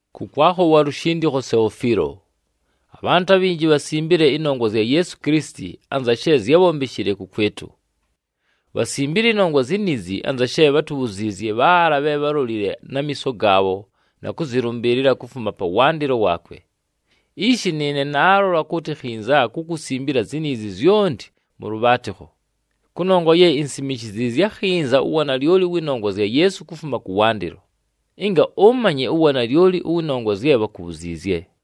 Kʉkwakho wa lushindikho Seofiilo: Abhantʉ abhinji bhasimbile ɨnongwa zya Yeesu Kilisiti anza she zyábhombeshile kʉkwɨtʉ. Bhasimbile ɨnongwa ziniizi anza she bhátubhuziizye bhaala bhe bhálolile na miiso gaabho na kʉzɨlʉmbɨɨlɨla kufuma pawandɨlo waakwe. Ishi nɨɨne naalola kʉtɨ khinza kukusimbila ziniizi zyonti mʉ lʉbhaatɨkho, kʉnongwa ye insimishiziizye akhinza uwanalyoli ʉwɨ nongwa zya Yeesu kufuma kʉwandɨlo, ɨnga ʉmanye uwanalyoli ʉwɨ nongwa zye bhakubhuziizye.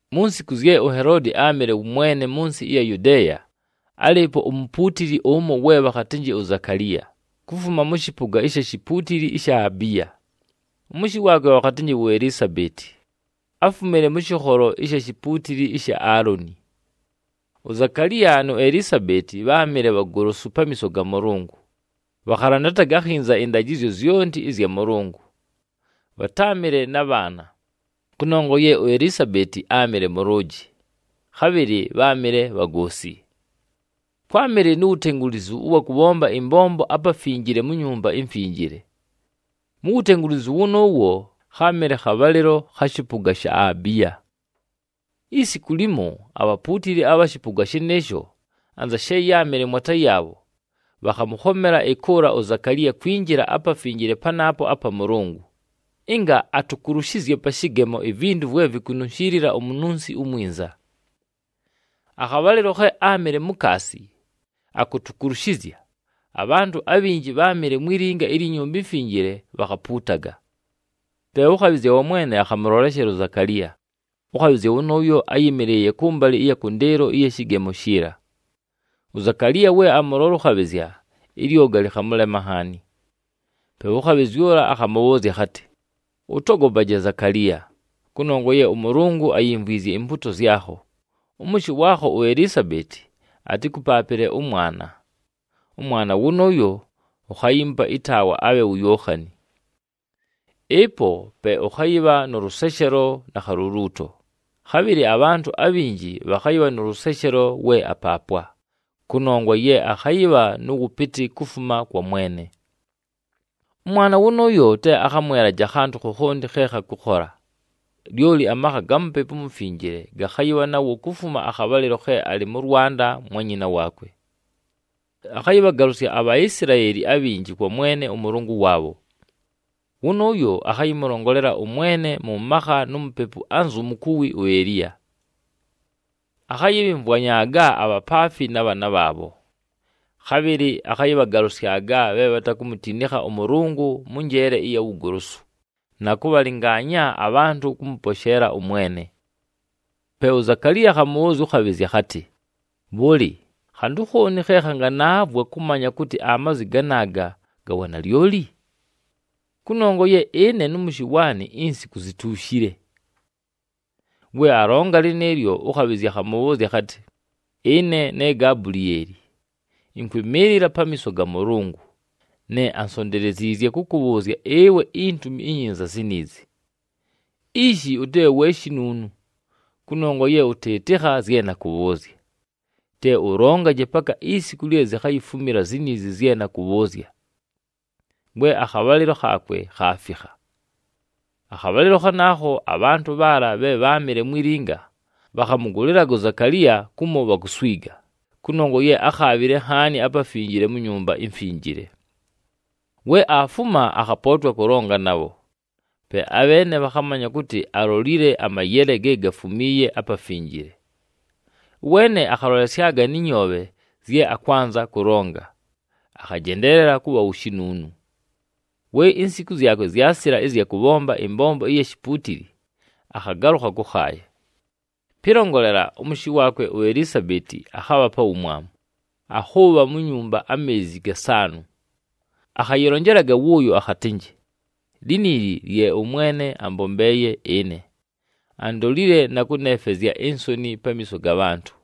Mu nsiku zye uHeloodi áamɨle wʉ mwene mʉ nsɨ ɨya Yudeeya, álɨɨpo umupuutili ʉmo we bhakhatɨnjɨ uZakaliya, kufuma mʉ shɨpʉga ɨsha shipuutili ɨsha Abiya. Ʉmʉshɨ waakwe bhakhatɨnjɨ uElisabeeti, áfumile mʉ shɨkholo ɨsha shipuutili ɨsha Aaloni. UZakaliya nu Elisabeeti bháamɨle bhagolosu pamiiso ga Mʉlʉngʉ, bhakhalandataga akhinza ɨndajɨzyo zyonti ɨzya Mʉlʉngʉ. Bhatáamɨle na bhaana, kʉnongwa ye uElisabeeti áamɨle mʉlʉʉjɨ, khabhɨlɨ bháamɨle bhagoosi. Kwámɨle nu wutengulizu ʉwa kʉbhomba ɨmbombo aPafinjile mu Nyumba iMfinjile. Mu wutengulizu wʉnʉʉwo, kháamɨle khabhalɨlo kha shɨpʉga sha Abiya. Isiku limo, abhapuutili abha shɨpʉga shɨnɨɨsho, anza she yáamɨle mwata yaabho, bhakhamʉkhomela ɨkʉʉla uZakaliya kwinjila aPafinjile panaapo apa Mʉlʉngʉ, ɨnga atukulushizye pa shɨgemo ivintu vwe vikununshiilila umununsi umwinza. Akhabhalɨlo khe áamɨle mukaasi akutukulushizya, abhantʉ abhinji bháamɨle mwi linga ilyi Nyumba iMfinjile bhakhapuutaga. Pe ʉkhabhɨzya wa Mwene akhamʉloleshela uZakaliya. Ʉkhabhɨzya wʉnʉʉyo áyɨmɨlɨɨye kʉmbalɨ ɨya kʉndɨɨlo ɨya shɨgemo shiila. UZakaliya we amʉlola ʉkhabhɨzya, ɨlyoga lɨkhamʉlema nhaani. Pe ʉkhabhɨzya ʉla akhamʉbhʉʉzya akhatɨ, “Ʉtogopaje Zakaliya, kʉnongwa ye ʉMʉlʉngʉ ayimvwizye impuuto zyakho, ʉmʉshɨ waakho uElisabeeti atɨkʉpaapɨle ʉmwana, ʉmwana wʉnʉʉyo ukhayiimupa ɨtaawa abhe wu Yookhani. Ɨpo pe ʉkhayɨbha nʉ lʉseshelo na khaluluuto, khabhɨlɨ abhantʉ abhinji bhakhayɨbha nʉ lʉseshelo we apaapwa, kʉnongwa ye akhayɨbha nʉ wʉpɨtɨ kufuma kwa Mwene. Ʉmwana wʉnʉʉyo te akhamwelaje akhantʉ khokhonti khe khakʉkhola, lyoli amakha ga Mupepu uMufinjile gakhayɨbha nawo kufuma akhabhalɨlo khe alɨ mʉ lwanda mwa nyina waakwe. Akhayɨbhagalʉsya aBhaisilaeli abhinji kwa Mwene ʉMʉlʉngʉ waabho. Wʉnʉʉyo akhayɨmʉlongolela ʉMwene mʉ makha nu mupepu anzu mukuwi uEliya. Akhayɨbhɨmvwanyaaga abhapaafi na bhaana bhaabho, khabhɨlɨ akhayɨbhagalʉsyaga bhe bhatakumutinikha ʉMʉlʉngʉ mʉ njeele ɨya wugolosu, na kʉbhalɨngaanya abhantʉ kʉmʉposheela ʉMwene.” Pe uZakaliya akhamʉbhʉʉzya ʉkhabhɨzya akhatɨ, “Bhʉlɨ, khantʉ khooni khe khanganaavwa kʉmanya kʉtɨ amazwi ganaaga ga wanalyoli? Kʉnongwa ye ɨne nʉ mʉshɨ waanɨ insiku zituushile.” We alonga lɨnɨɨlyo, ʉkhabhɨzya akhamʉbhʉʉzya akhatɨ, “Ɨne ne Gabulieli, ɨnkwɨmɨɨlɨla pamiiso ga Mʉlʉngʉ, ne ansonteleziizye kʉkʉbhʉʉzya ɨwe intumi inyinza ziniizi. Ishi ʉtɨbhe we shinuunu, kʉnongwa ye ʉtɨɨtɨkha zye nakʉbhʉʉzya. Te ʉlongaje paka isiku lye zikhayifumila ziniizi zye nakʉbhʉʉzya, we akhabhalɨlo khaakwe khaafikha!” Akhabhalɨlo khanaakho, abhantʉ bhaala bhe bháamɨle mwi linga, bhakhamʉgʉlɨlaga uZakaliya kumo bhakuswiga, kʉnongwa ye ákhaabhile nhaani aPafinjile mu Nyumba iMfinjile. We aafuma, akhapootwa kʉlonga nabho, pe abheene bhakhamanya kʉtɨ, alolile amayele ge gafumiiye aPafinjile. Ʉweene akhalolesyaga nɨ nyoobhe zye akwanza kʉlonga, akhajendeelela kʉbha wu shinuunu. We insiku zyakwe zyasila ɨzya kʉbhomba ɨmbombo ɨya shipuutili, akhagalʉkha kʉkhaaya. Pɨlongolela, ʉmʉshɨ waakwe uElisabeeti akhabha pa wumwamu, akhʉʉbha mu nyumba ameezi gasaanʉ. Akhayɨlonjelaga wʉʉyo akhatɨnjɨ, “Liniili lye ʉMwene ambombeeye ɨne, andolile na kʉneefwezya insoni pamiiso ga bhantʉ.”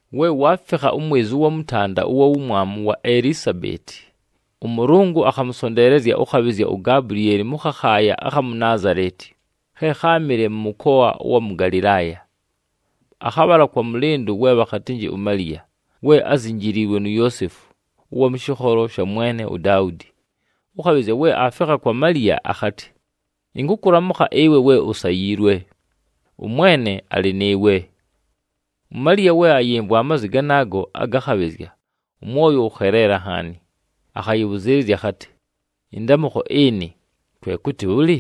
We waafikha umwezi ʉwa mʉtanda ʉwa wumwamu wa Elisabeeti, ʉMʉlʉngʉ akhamʉsonteelezya ʉkhabhɨzya uGabulieli mʉ khakhaaya akha mu Naazaleti, khe kháamɨle mʉ mʉkoa ʉwa mʉ Galɨlaaya. Akhabhala kwa mʉlɨndʉ we bhakhatɨnjɨ uMaliya, we ázinjiliilwe nu Yoosefu ʉwa mʉ shɨkholo sha mwene uDaudi. Ʉkhabhɨzya we aafikha kwa Maliya akhatɨ, “Ɨnkʉkʉlamʉkha ɨwe we usayiilwe, ʉMwene alɨ nɨɨwe.” UMaliya, we ayɨmvwa amazwi ganaago aga khabhɨzya, ʉmwoyo wʉkheleela nhaani, akhayɨbhʉzɨɨlɨzya akhatɨ, “Ɨndamʉkho ɨnɨ, kwe kʉtɨ bhʉlɨ?”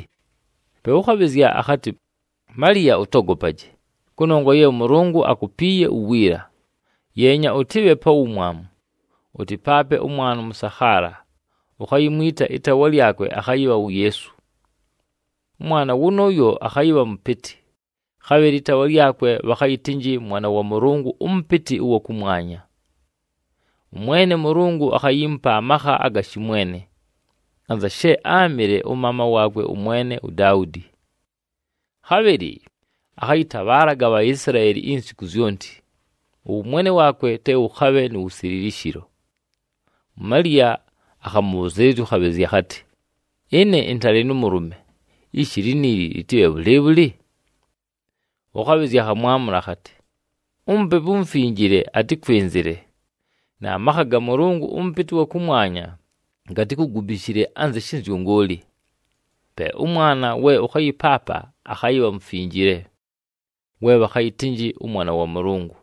Pe ʉkhabhɨzya akhatɨ, “Maliya, ʉtogopaje, kʉnongwa ye ʉMʉlʉngʉ akupiiye uwiila. Yeenya, ʉtɨbhe pa wumwamu, ʉtɨpaape ʉmwana ʉmʉsakhaala, ukhayimwita ɨtaawa lyakwe akhayɨbha wu Yeesu. Ʉmwana wʉnʉʉyo akhayɨbha mʉpɨtɨ, khabhɨlɨ ɨtaawa lyakwe bhakhayɨtɨnjɨ Mwana wa Mʉlʉngʉ ʉMʉpɨtɨ ʉwa kʉmwanya. ɄMwene ʉMʉlʉngʉ akhayiimupa amakha aga shɨmwene, anza she áamɨle ʉmaama waakwe ʉmwene uDaudi. Khabhɨlɨ akhayɨtabhaalaga aBhaisilaeli insiku zyonti, ʉwʉmwene waakwe te wʉkhabhe nu wusililishilo.” UMaliya akhamʉbhʉzɨɨlɨzya ʉkhabhɨzya akhatɨ, “Ɨne ɨntalɨ nʉ mʉlʉme, ishi liniili lɨtɨbhe bhʉlɨɨbhʉlɨ?” Ʉkhabhɨzya akhamwamʉla akhatɨ, “UMupepu uMufinjile atɨkwɨnzɨle, na makha ga Mʉlʉngʉ ʉMʉpɨtɨ ʉwa kʉmwanya gatikugubishile anzɨ shɨnzyʉngʉʉlɨ. Pe ʉmwana we ʉkhayɨpaapa akhayɨbha mufinjile, we bhakhayɨtɨnjɨ ʉMwana wa Mʉlʉngʉ.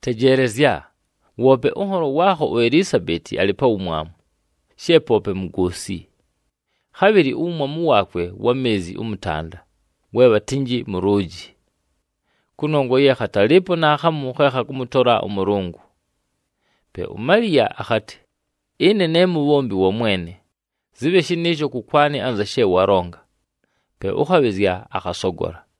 Tejeelezya! Woope ʉnholo waakho uElisabeeti alɨ pa wumwamu, she poope mugoosi. Khabhɨlɨ uwumwamu waakwe wa meezi ʉmʉtanda, we bhatɨnjɨ mʉlʉʉjɨ! Kʉnongwa ye khatalɨɨpo naakhamu khe khakʉmʉtola ʉMʉlʉngʉ.” Pe uMaliya akhatɨ, “Ɨne ne mubhombi wa Mwene, zɨbhe shɨnɨɨsho kʉkwanɨ anza she walonga.” Pe ʉkhabhɨzya akhasogola.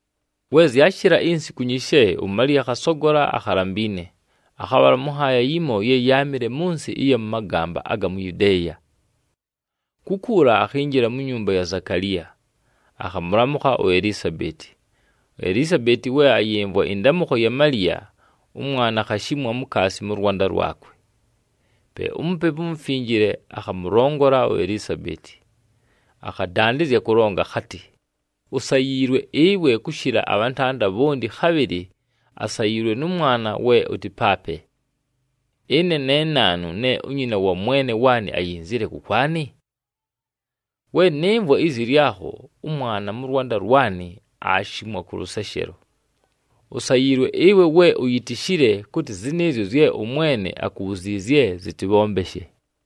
We zyashɨla insiku nyishe, uMaliya akhasogola akhalambiine, akhabhala mʉ nhaaya yimo ye yáamɨle mʉ nsɨ ɨya mʉ magamba aga mu Yudeeya. Kukuula akhinjila mu nyumba ya Zakaliya, akhamʉlamʉkha uElisabeeti. UElisabeeti we ayɨmvwa ɨndamʉkho ya Maliya, ʉmwana akhashimwa mukaasi mʉ lwanda lwakwe. Pe uMupepu uMufinjile akhamʉlongola uElisabeeti, akhadandɨzya kʉlonga akhatɨ, “Usayiilwe ɨwe kʉshɨla abhantanda bhonti, khabhɨlɨ asayiilwe nʉ mwana we ʉtɨpaape. Ɨne ne naanu ne unyina wa Mwene waanɨ ayinzile kʉkwanɨ? We nɨmvwa izi lyakho, ʉmwana mʉ lwanda lwanɨ aashimwa kʉ lʉseshelo. Usayiilwe ɨwe we uyitishile kʉtɨ zɨnɨɨzyo zye ʉMwene akubhuziizye, zɨtɨbhombeshe.”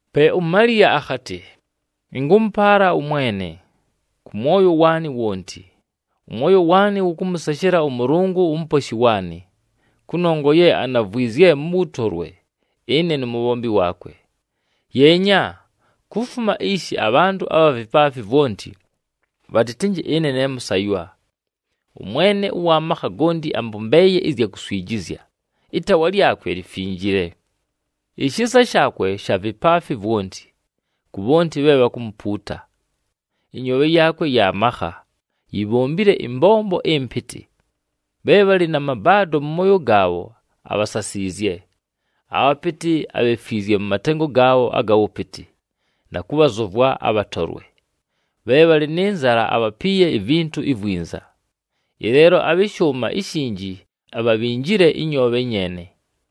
Pe uMaliya akhatɨ, “Ɨnkʉmʉpaala ʉMwene, kʉ mwoyo waanɨ wonti. Ʉmwoyo waanɨ wʉkʉmʉseshela ʉMʉlʉngʉ uMuposhi waanɨ, kʉnongwa ye anavwizye mʉ wʉtolwe ɨne numubhombi waakwe. Yeenya, kufuma ishi abhantʉ abha vipaafi vwonti, bhatɨtɨnjɨ ɨne ne mʉsaywa. ɄMwene ʉwa makha gonti ambombeeye ɨzya kuswijizya, ɨtaawa lyakwe lifinjile. Ishisa shaakwe sha vipaafi vwonti, ku bhonti bhe bhakumupuuta. Ɨnyoobhe yaakwe ya makha, yibhombile ɨmbombo ɨmpɨtɨ. Bhe bhalɨ na mabaado mʉ mooyo gaabho, abhasasiizye. Abhapɨtɨ abhefwizye mʉ matengo gaabho aga wʉpɨtɨ, na kʉbhazʉvwa abhatolwe. Bhe bhalɨ nɨ nzala, abhapiiye ivintu ivwinza, ɨleelo abhɨ shʉʉma ishinji abhabhinjile ɨnyoobhe nyeene.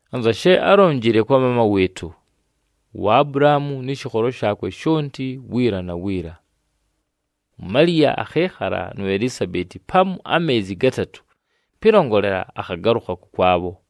anza she álonjile kwa maama wɨɨtʉ, uAbulahaamu nɨ shɨkholo shaakwe shonti wiila na wiila.” UMaliya akhɨɨkhala nu Elisabeeti pamu ameezi gatatʉ, pɨlongolela, akhagalʉkha kʉkwabho.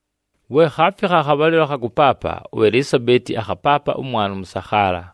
We khaafikha akhabhalɨlo akha kʉpaapa, uElisabeeti akhapaapa ʉmwana ʉmʉsakhaala.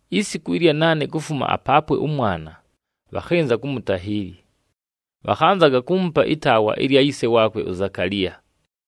Isiku ɨlya naane kufuma apaapwe ʉmwana, bhakhɨnza kumutahiili. Bhakhanzaga kuumupa ʉmwana ɨtaawa lya yise waakwe, uZakaliya.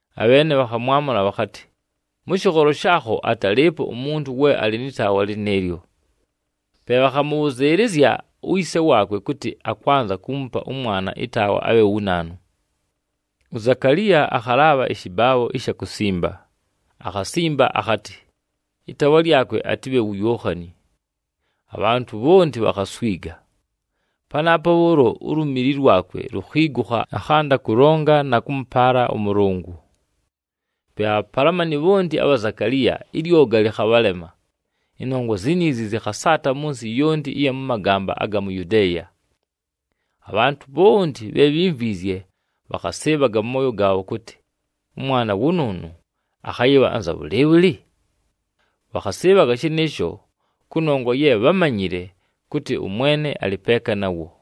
Abheene bhakhamwamʉla bhakhatɨ, “Mʉ shɨkholo shaakho atalɨɨpo umuntu we alɨ nɨ taawa lɨnɨɨlyo.” Pe bhakhamʉbhʉzɨɨlɨzya uyise waakwe kʉtɨ akwanza kuumupa ʉmwana ɨtaawa abhe wu naanu. UZakaliya akhalaabha ɨshɨbaabho ɨsha kusimba, akhasimba akhatɨ, “Ɨtaawa lyakwe atɨbhe wu Yookhani.” Abhantʉ bhonti bhakhaswiga. Panaapo bhʉʉlo ulumili lwakwe lukhiigukha, akhanda kʉlonga na kʉmʉpaala ʉMʉlʉngʉ. Pe abhapalamani bhonti abha Zakaliya, ɨlyoga lɨkhabhalema. Ɨnongwa ziniizi zɨkhasaata mʉ nsɨ yonti ɨya mʉ magamba aga mu Yudeeya. Abhantʉ bhonti bhe bhimvwizye, bhakhasɨɨbhaga mʉ mooyo gaabho kʉtɨ, “Ʉmwana wʉnʉʉnʉ akhayɨbha anza bhʉlɨɨbhʉlɨ?” Bhakhasɨɨbhaga shɨnɨɨsho, kʉnongwa ye bhámanyile kʉtɨ ʉMwene alɨ peeka nawo.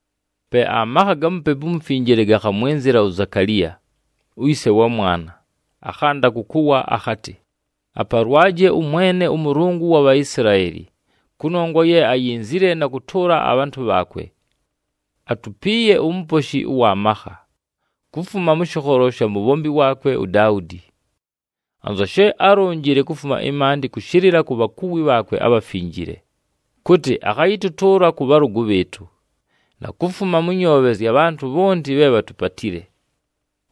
Pe amakha ga Mupepu uMufinjile gakhamwɨnzɨla uZakaliya, uyise wa mwana, akhanda kʉkʉwa akhatɨ, “Apalwaje ʉMwene ʉMʉlʉngʉ ʉwa Bhaisilaeli, kʉnongwa ye ayinzile na kʉtʉʉla abhantʉ bhaakwe. Atupiiye uMuposhi ʉwa makha, kufuma mʉ shɨkholo sha mubhombi waakwe uDaudi. Anza she álonjile kufuma ɨmaandɨ kʉshɨlɨla ku bhakuwi bhaakwe abhafinjile, kʉtɨ akhayɨtʉtʉʉla kʉ bhalʉgʉ bhɨɨtʉ, na kufuma mʉ nyoobhe zya bhantʉ bhonti bhe bhatupatile.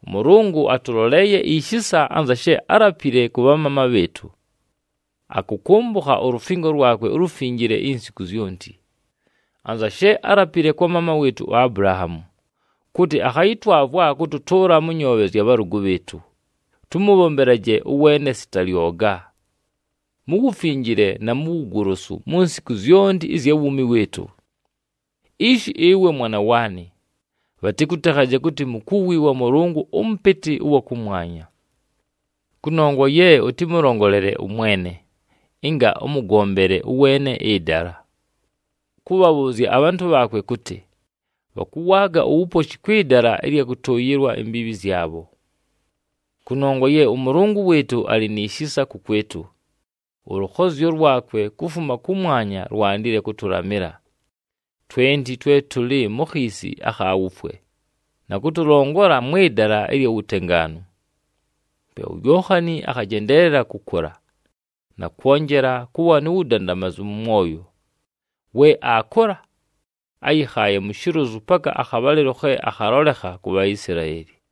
ɄMʉlʉngʉ atʉloleeye ishisa, anza she álapile kʉ bhamaama bhɨɨtʉ, akʉkʉmbʉkha ulufingo lwakwe ulufinjile insiku zyonti. Anza she álapile kwa maama wɨɨtʉ uAbulahaamu, kʉtɨ akhayɨtwavwa kʉtʉtʉʉla mʉ nyoobhe zya bhalʉgʉ bhɨɨtʉ, tʉmʉbhombelaje ʉweene sita lyoga, mu wufinjile na mu wugolosu mu nsiku zyonti ɨzya wuumi wɨɨtʉ. Ishi ɨwe mwana waanɨ, bhatɨkʉtekhaje kʉtɨ mukuwi wa Mʉlʉngʉ ʉMʉpɨtɨ ʉwa kʉmwanya, kʉnongwa ye ʉtɨmʉlongolele ʉMwene, ɨnga ʉmʉgombele ʉweene ɨdala, kʉbhabhʉʉzya abhantʉ bhaakwe kʉtɨ, bhakʉwaaga uwuposhi kwɨ dala ɨlya kʉtʉʉyɨlwa imbiibhi zyabho. Kʉnongwa ye ʉMʉlʉngʉ wɨɨtʉ alɨ ni shisa kʉkwɨtʉ, ʉlʉkhozyo lwakwe kufuma kʉmwanya lwandile kʉtʉlamɨla, twenti twe tʉlɨ mu khiisi akha wufwe, na kʉtʉlongola mwɨ dala ɨlya wutengaanu.” Pe uYookhani akhajendeelela kʉkʉla, na kwonjela kʉbha nu wudandamazu mʉ mwoyo. We aakʉla, áyɨkhaaye mu shilozu paka akhabhalɨlo khe akhalolekha ku Bhaisilaeli.